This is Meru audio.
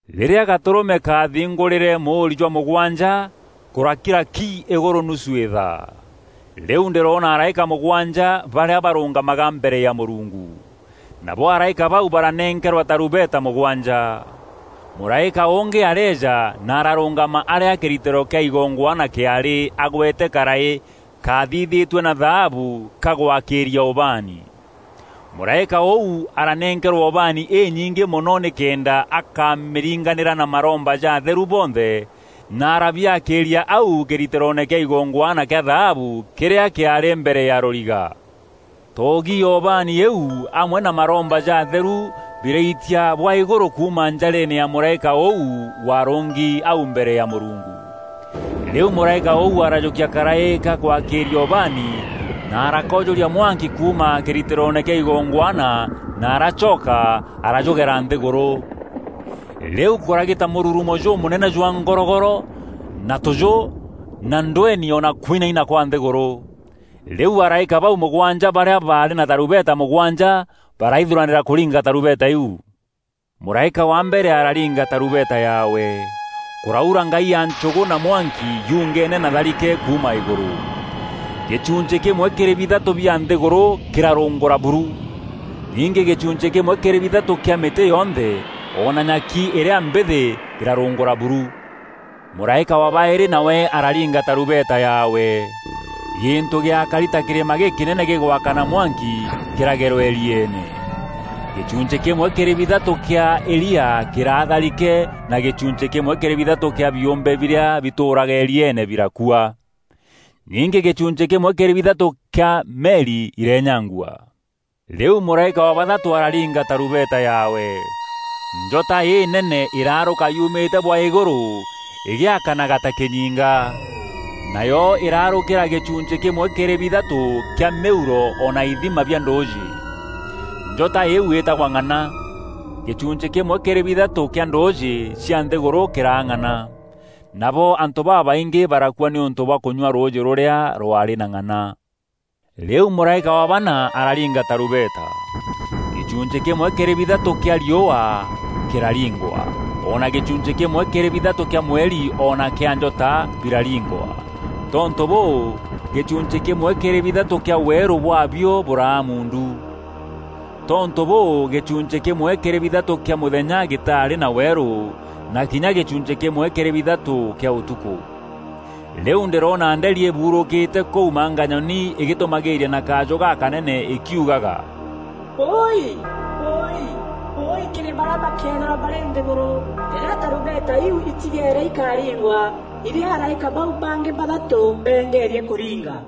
Rîrîa Gatûrûme kaathingûrîre mûûri jwa mûgwanja, kûrakira ki îgûrû nusu îthaa. Rîu ndîroona araîka mûgwanja barîa barûngamaga mbere ya Mûrungu. Nabo araîka bau baranenkerwa tarumbeta mûgwanja. Mûraîka ûngî areeja na ararûngama arîa kîritîro kîa igongwana kîaarî agwete karaî kaathithîtue na thaabu ga gwakîîria ubaani. Mûraîka ûu aranenkerwa ubaani înyingî mono nîkenda akamîringanîra na maromba ja atheru bonthe na arabiakîîria au kîritîroone kîa igongwana kîa thaabu kîrîa kîaarî mbere ya rûriga. Toogi ya ubaani îîu amwe na maromba ja atheru biraitia bwa îgûrû kuuma njareene ya mûraîka ûu warûngi au mbere ya Mûrungu. Rîu mûraîka ûu arajûkia karaî ga gwakîîria ubaani na arakoojûria mwanki kuuma kîritîroone kîa igongwana na aracoka arajûgera nthîgûrû. Rîu kûragîta mûrurumo jûmûnene jwa ngorogoro na tûjû na ndweeni o na kwinaina kwa nthîgûrû. Rîu araîka bau mûgwanja barîa baarî na tarumbeta mûgwanja baraithuranîra kûringa tarumbeta iu. Mûraîka wa mbere araringa tarumbeta yaawe. Kûraura ngai ya nchûgû na mwanki yungene na tharike kuuma îgûrû. Gîchunchî kîmwe kîrî bithatû bia nthîgûrû kîrarûngûra buru. Ningî gîchunchî kîmwe kîrî bithatû kîa mîtî yonthe o na nyaki îrîa mbîthî kîrarûngûra buru. Mûraîka wa baîrî nawe araringa tarumbeta yaawe. Gîntû gîakari ta kîrîma gîkînene gîgwakana mwanki, kîragerwa îrieene. Gîchunchî kîmwe kîrî bithatû kîa îria kîraa tharike na gîchunchî kîmwe kîrî bithatû kîa biûmbe birîa bitûûraga îrieene birakua. Ningî gîchunchî kîmwe kîrî bithatû kîa meri ireenyangua. Rîu mûraîka wa bathatû araringa tarumbeta yaawe. Njota înene îraarûka yumîte bwa îgûrû îgîakanaga ta kînyinga. Nayo îraarûkîra gîchunchî kîmwe kîrî bithatû kîa mîuro o na ithima bia ndûûjî. Njota îîu iitagwa Ng'ana. Gîchunchî kîmwe kîrî bithatû kîa ndûûjî cia nthîgûrû kîraa ng'ana. Nabo antû babaingî barakua nîûntû bwa kûnyua rûûjî rûrîa rwaarî na ng'ana. Rîu mûraîka wa bana araringa tarumbeta. Gîchunchî kîmwe kîrî bithatû kîa riûa kîraringwa, o na gîchunchî kîmwe kîrî bithatû kîa mweri o na kîa njota biraringwa. Tontû bûû, gîchunchî kîmwe kîrî bithatû kîa weerû bwaabio bûraa muundu. Tontû bûû gîchunchî kîmwe kîrî bithatû kîa mûthenya gîtarî na weerû, na kinya gîchunchî kîmwe kîrî bithatû kîa ûtukû. Rîu ndîroona nderi îbuurûkîte kûu manganyoni îgîtûmagîîria na kajû gakanene îkiugaga, “Wûûi, wûûi, wûûi kîrî barîa bakeethîrwa barî nthîgûrû rîrîa tarumbeta iu itigeere ikaringwa irîa araîka bau bangî bathatû beengerie kûringa!”